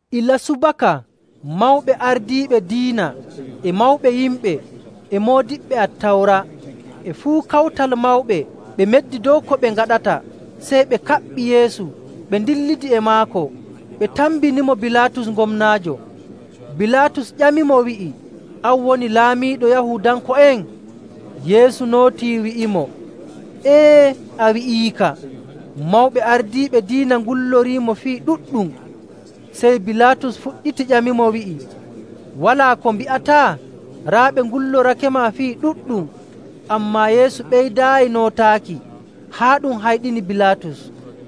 Ilaa subaka mawɓe ardiiɓe diina, e mawɓe yimɓe, e moodiɓɓe Attawra, e fuu Kawtal Mawɓe ɓe meddi dow ko ɓe ngaɗata. Sey ɓe kaɓɓi Yeesu ɓe ndillidi e maako, ɓe tambinimo Bilaatus gomnaajo. Bilaatus ƴamimo, wi'i, “An woni laamiiɗo Yahuudanko'en?” Yeesu nootii, wi'imo, “Ee, a wi'iika.” Mawɓe ardiiɓe diina ngulloriimo fii ɗuɗɗum. Sey Bilaatus fuɗɗiti ƴamimo, wi'i, “Walaa ko mbi'ataa? Raa ɓe ngullorakema fii ɗuɗɗum.” Ammaa Yeesu ɓeydaayi nootaaki, haa ɗum hayɗini Bilaatus.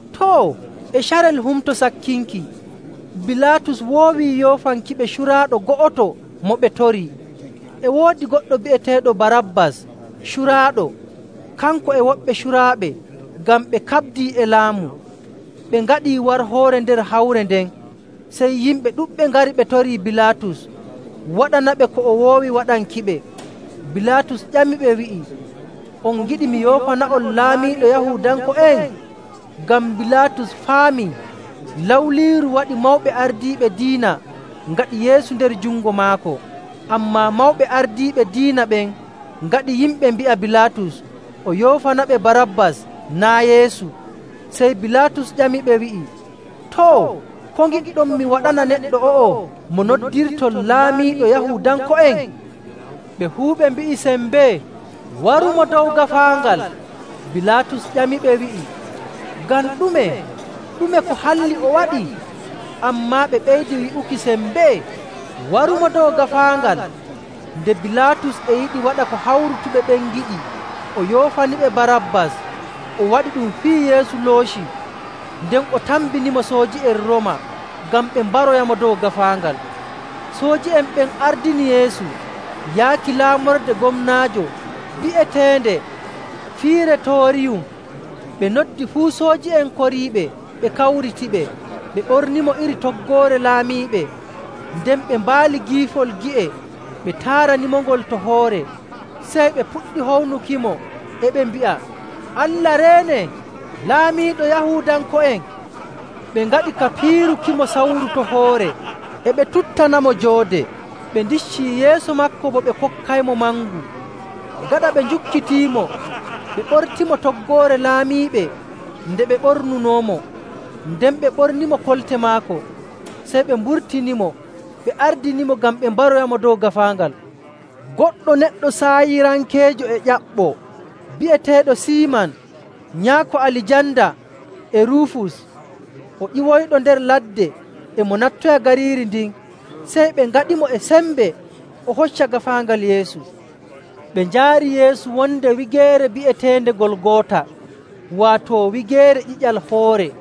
Too, e carel Humto Sakkinki Bilaatus woowii yoofankiɓe curaaɗo go'oto mo ɓe torii. E woodi goɗɗo bi'eteeɗo Barabbas curaaɗo, kanko e woɓɓe curaaɓe ngam ɓe kaɓdii e laamu, ɓe ngaɗii warhoore nder hawre nden. Sey yimɓe ɗuɗɓe ngari ɓe torii Bilaatus waɗanaɓe ko o woowi waɗankiɓe. Bilaatus ƴamiɓe wi'i, “On ngiɗi mi yoofana'on Laamiiɗo Yahuudanko'en?” Ngam Bilaatus faamii lawliiru waɗi mawɓe ardiiɓe diina ngaɗi Yeesu nder jungo maako. Ammaa mawɓe ardiiɓe diina ɓen ngaɗi yimɓe mbi'a Bilaatus o yoofanaɓe Barabbas naa' Yeesu. Sey Bilaatus ƴamiɓe, wi'i, “Too, ko ngiɗɗon mi waɗana neɗɗo o'o mo noddirton Laamiiɗo Yahuudanko'en?” Ɓe fuu ɓe mbi'i sembee, “Warumo dow gaafaangal!” Bilaatus ƴamiɓe, wi'i, “Ngam ɗume? Ɗume ko halli o waɗi?” Ammaa ɓe ɓeydi wi'uki sembee, “Warumo dow gaafaangal!” Nde Bilaatus e yiɗi waɗa ko hawrutuɓe ɓen ngiɗi, o yoofaniɓe Barabbas. O waɗi ɗum fiyi Yeesu looci, nden o tambinimo sooji'en Rooma ngam ɓe mbaroyamo dow gaafaangal. Sooji'en ɓen ardini Yeesu yaaki laamorde gomnaajo bi'eteende “Firetooriyum.” Ɓe noddi fuu sooji'en koriiɓe ɓe kawritiɓe. Ɓe ɓornimo iri toggoore laamiiɓe, nden ɓe mbaali giifol gi'e, ɓe taaranimongol to hoore. Sey ɓe puɗɗi hownukimo, e ɓe mbi'a, “Allah reene, laamiiɗo Yahuudanko'en!” Ɓe ngaɗi ka piirukimo sawru to hoore. E ɓe tuttanamo joode. Ɓe ndiccii yeeso maako bo ɓe kokkaymo mangu. Gaɗa ɓe njukkitiimo, ɓe ɓortimo toggoore laamiiɓe nde ɓe ɓornunoomo, nden ɓe ɓornimo kolte maako. Sey ɓe mburtinimo ɓe ardinimo ngam ɓe mbaroyamo dow gaafaangal. Goɗɗo neɗɗo Saayirankeejo e ƴaɓɓoo bi'eteeɗo Siiman, nyaako Alijanda e Ruufus. O ƴiwoyɗo nder ladde e mo nattoya gariiri ndin. Sey ɓe ngaɗimo e sembe o hocca gaafaangal Yeesu.. Ɓe njaari Yeesu wonde wigeere bi'eteende Golgoota, waato “Wigeere Ƴiƴal Hoore.”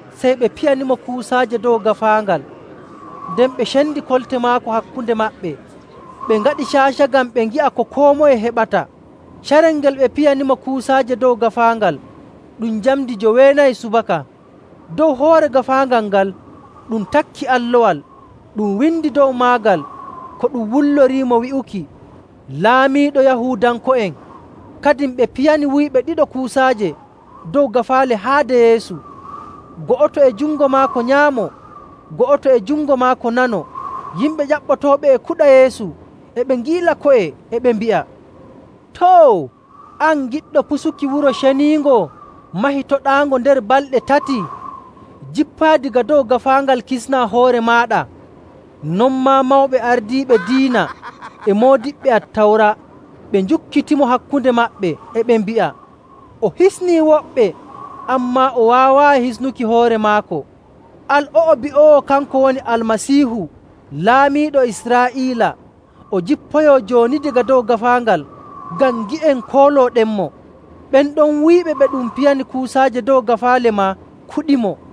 Sey, ɓe piyanimo kuusaaje dow gaafaangal. Nden ɓe cendi kolte maako hakkunde maɓɓe, ɓe ngaɗi caaca ngam ɓe ngi'a ko koo moye heɓata.. Carel ngel ɓe piyanimo kuusaaje dow gaafaangal ɗum njamndi joweenayi subaka. Dow hoore gaafaangal ngal ɗum takki allowal. Ɗum windi dow maagal ko ɗum wulloriimo wi'uki, “Laamiiɗo Yahuudanko'en.” Kadin ɓe piyani wuyɓe ɗiɗo kuusaaje dow gaafaale haade Yeesu, go'oto e jungo maako nyaamo, go'oto e jungo maako nano. Yimɓe ƴaɓɓotooɓe e kuɗa Yeesu e ɓe ngiila ko'e, e ɓe mbi'a, “Too! An giɗɗo pusuki Wuro Ceniingo mahitoɗaango nder balɗe tati,. jippoya daga dow gaafaangal kisnaa hoore maaɗa!” Non maa mawɓe ardiiɓe diina e moodiɓɓe Attawra ɓe njukkitimo hakkunde maɓɓe, e ɓe mbi'a, “O hisnii woɓɓe, ammaa o waawaayi hisnuki hoore maako. Al o'o bi'oowo kanko woni Almasiihu, Laamiiɗo Israa'iila, o jippoyoo jooni daga dow gaafaangal ngam ngi'en koolooɗenmo.” Ɓen ɗon wuyɓe ɓe ɗum piyani kuusaaje dow gaafaale maa kuɗimo.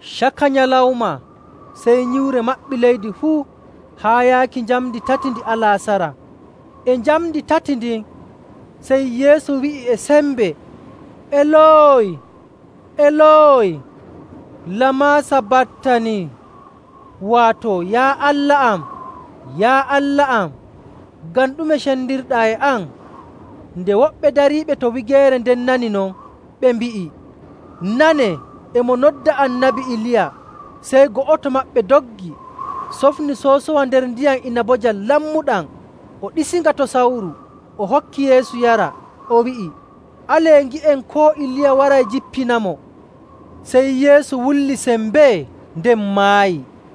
Caka nyalawma, sey nyiwre maɓɓi leydi fuu haa yaaki njamndi tati ndi alaasara. E njamndi tati ndin, sey Yeesu wi'i e sembe, “Eloy, Eloy, lama sabattani?” waato, “Yaa Allah am, Yaa Allah am, ngam ɗume cendirɗaa e am?”. Nde woɓɓe dariiɓe to wigeere nden nani non, ɓe mbi'i, “Nanee, e mo nodda Annabi Iliya.” Sey go'oto maɓɓe doggi sofni soosowa nder ndiyam inabojam lammuɗam, o ɗiisinga to sawru, o hokki Yeesu yara. O wi'i, “Alee ngi'en koo Iliya waray jippinamo.” Sey Yeesu wulli sembee, nden maayi.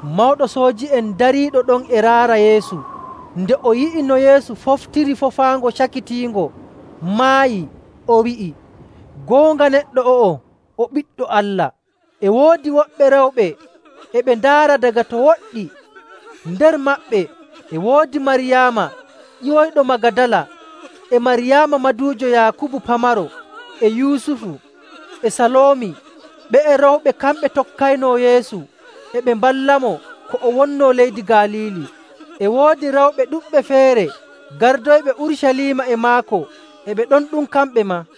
Mawɗo sooji'en dariiɗo ɗon e raara Yeesu. Nde o yi'i no Yeesu foftiri foofaango cakitiingo, maayi, o wi'i, “Goonga, neɗɗo o'o o Ɓiɗɗo Allah!” E woodi woɓɓe rewɓe e ɓe ndaara daga to woɗɗi. Nder maɓɓe e woodi Maryaama ƴiwoyɗo Magadala, e Maryaama maduujo Yaakubu pamaro, e Yusufu, e Saloomi. Ɓe'e rewɓe kamɓe tokkaynoo Yeesu, e ɓe mballamo ko o wonnoo leydi Galiili. E woodi rewɓe ɗuɗɓe feere gardoyɓe Urucaliima e maako e ɓe ɗon ɗum kamɓe maa..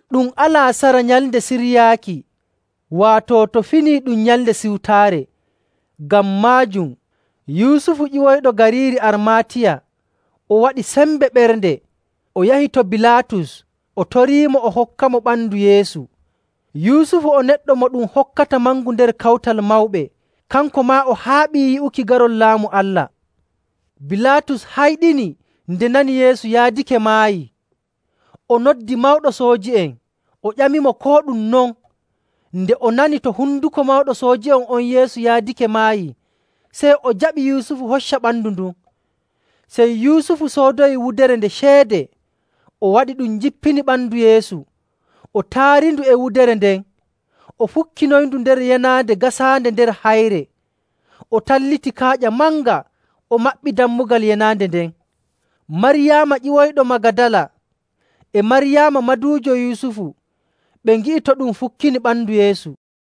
Ɗum alaasara Nyalnde Siryaaki, waato to finii ɗum Nyalnde Siwtaare. Ngam maajum Yusufu ƴiwoyɗo gariiri Armaatiya, o waɗi sembe ɓernde, o yahi to Bilaatus, o toriimo o hokkamo ɓandu Yeesu. Yusufu o neɗɗo mo ɗum hokkata mangu nder Kawtal Mawɓe, kanko maa o haaɓii yi'uki garol Laamu Allah. Bilaatus hayɗini nde nani Yeesu yaadake maayii. O noddi mawɗo sooji'en, o ƴamimo koo ɗum non. Nde o nani to honduko mawɗo sooji'en on Yeesu yaadake maayi, sey o jaɓi Yusufu hocca ɓandu ndun. Sey Yusufu soodoyi wudere nde ceede, o waɗi ɗum jippini ɓandu Yeesu, o taarindu e wudere nden, o fukkinoyindu nder yenaande gasaande nder hayre. O talliti kaaƴa manga o maɓɓi dammugal yenaande nden. Maryaama ƴiwoyɗo Magadala e Maryaama maduujo Yusufu ɓe ngi'i to ɗum fukkini ɓandu Yeesu.